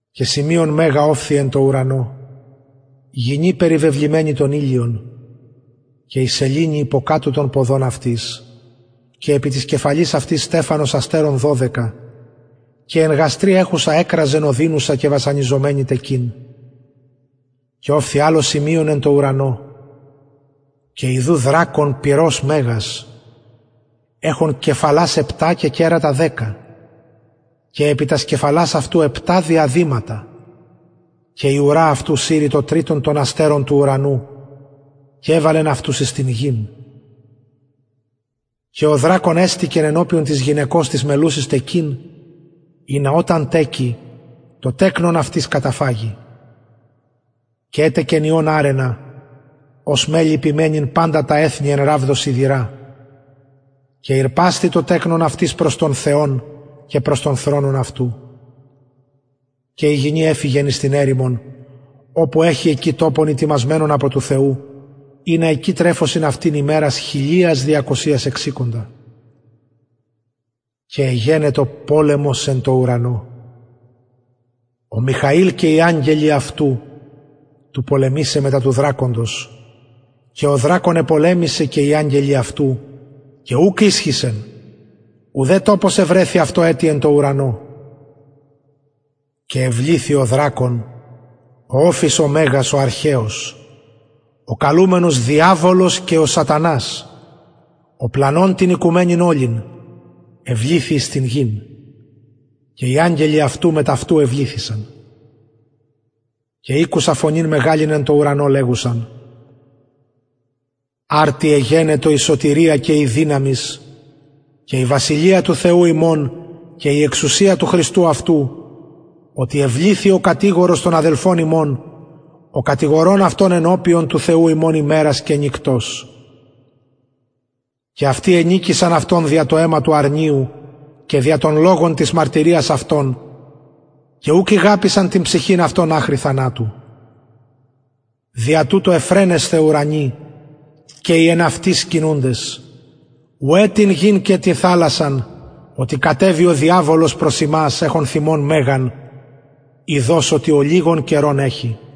και σημειον μεγα ωφθη εν τω ουρανω γυνη περιβεβλημενη τον ηλιον και η σεληνη υποκατω των ποδων αυτης και επι της κεφαλης αυτης στεφανος αστερων δωδεκα και εν γαστρι εχουσα εκραζεν ωδινουσα και βασανιζομενη τεκειν και ωφθη αλλο σημειον εν τω ουρανω και ιδου δρακων πυρος μεγας εχων κεφαλας επτα και κερατα δεκα και επι τας κεφαλας αυτου επτα διαδηματα και η ουρα αυτου συρει το τριτον των αστερων του ουρανου και εβαλεν αυτους εις την γην και ο δρακων εστηκεν ενωπιον της γυναικος της μελλουσης τεκειν ινα οταν τεκη το τεκνον αυτης καταφαγη και ετεκεν υιον αρρενα ος μελλει ποιμαινειν παντα τα εθνη εν ραβδω σιδηρα και ηρπασθη το τεκνον αυτης προς τον θεον και προς τον θρονον αυτου και η γυνη εφυγεν εις την ερημον οπου εχει εκει τοπον ητοιμασμενον υπο του θεου ινα εκει εκτρεφωσιν αυτην ημερας χιλιας διακοσιας εξηκοντα και εγενετο πολεμος εν τω ουρανω ο μιχαηλ και οι αγγελοι αυτου πολεμησαι μετα του δρακοντος και ο δρακων επολεμησεν και οι αγγελοι αυτου και ουκ ισχυσεν ουδε τοπος ευρεθη αυτω ετι εν τω ουρανω και εβληθη ο δρακων ο μεγας ο οφις ο αρχαιος ο καλουμενος διαβολος και σατανας ο πλανων την οικουμενην ολην εβληθη εις την γην και οι αγγελοι αυτου μετ αυτου εβληθησαν και ηκουσα φωνην μεγαλην εν τω ουρανω λεγουσαν αρτι εγενετο η σωτηρια και η δυναμις και η βασιλεια του θεου ημων και η εξουσια του χριστου αυτου οτι εβληθη ο κατηγορος των αδελφων ημων ο κατηγορων αυτων ενωπιον του θεου ημων ημερας και νυκτος και αυτοι ενικησαν αυτον δια το αιμα του αρνιου και δια τον λογον της μαρτυριας αυτων και ουκ ηγαπησαν την ψυχην αυτων αχρι θανατου δια τουτο ευφραινεσθε ουρανοι και οι εν αυτοις σκηνουντες ουαι τη γη και τη θαλασση οτι κατεβη ο διαβολος προς υμας εχων θυμον μεγαν ειδως οτι ολιγον καιρον εχει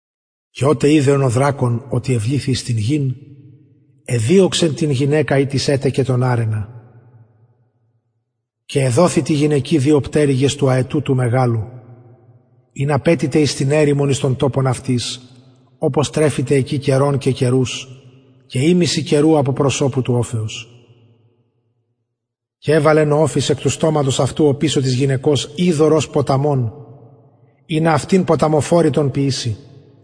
και οτε ειδεν ο δρακων οτι εβληθη εις την γην εδιωξεν την γυναικα ητις ετεκεν τον αρρενα και εδοθησαν τη γυναικι δυο πτερυγες του αετου του μεγαλου ινα πετηται εις την ερημον εις τον τοπον αυτης οπως τρεφηται εκει καιρον και καιρους και ημισυ καιρου απο προσωπου του οφεως και εβαλεν ο οφις εκ του στοματος αυτου οπισω της γυναικος υδωρ ως ποταμον ινα αυτην ποταμοφορητον ποιηση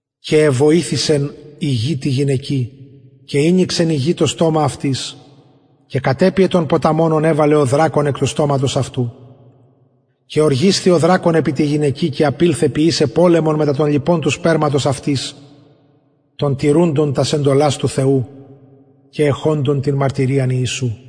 και εβοηθησεν η γη τη γυναικι και ηνοιξεν η γη το στομα αυτης και κατεπιεν τον ποταμον ον εβαλεν ο δρακων εκ του στοματος αυτου και ωργισθη ο δρακων επι τη γυναικι και απηλθεν ποιησαι πολεμον μετα των λοιπων του σπερματος αυτης των τηρουντων τας εντολας του θεου και εχοντων την μαρτυριαν ιησου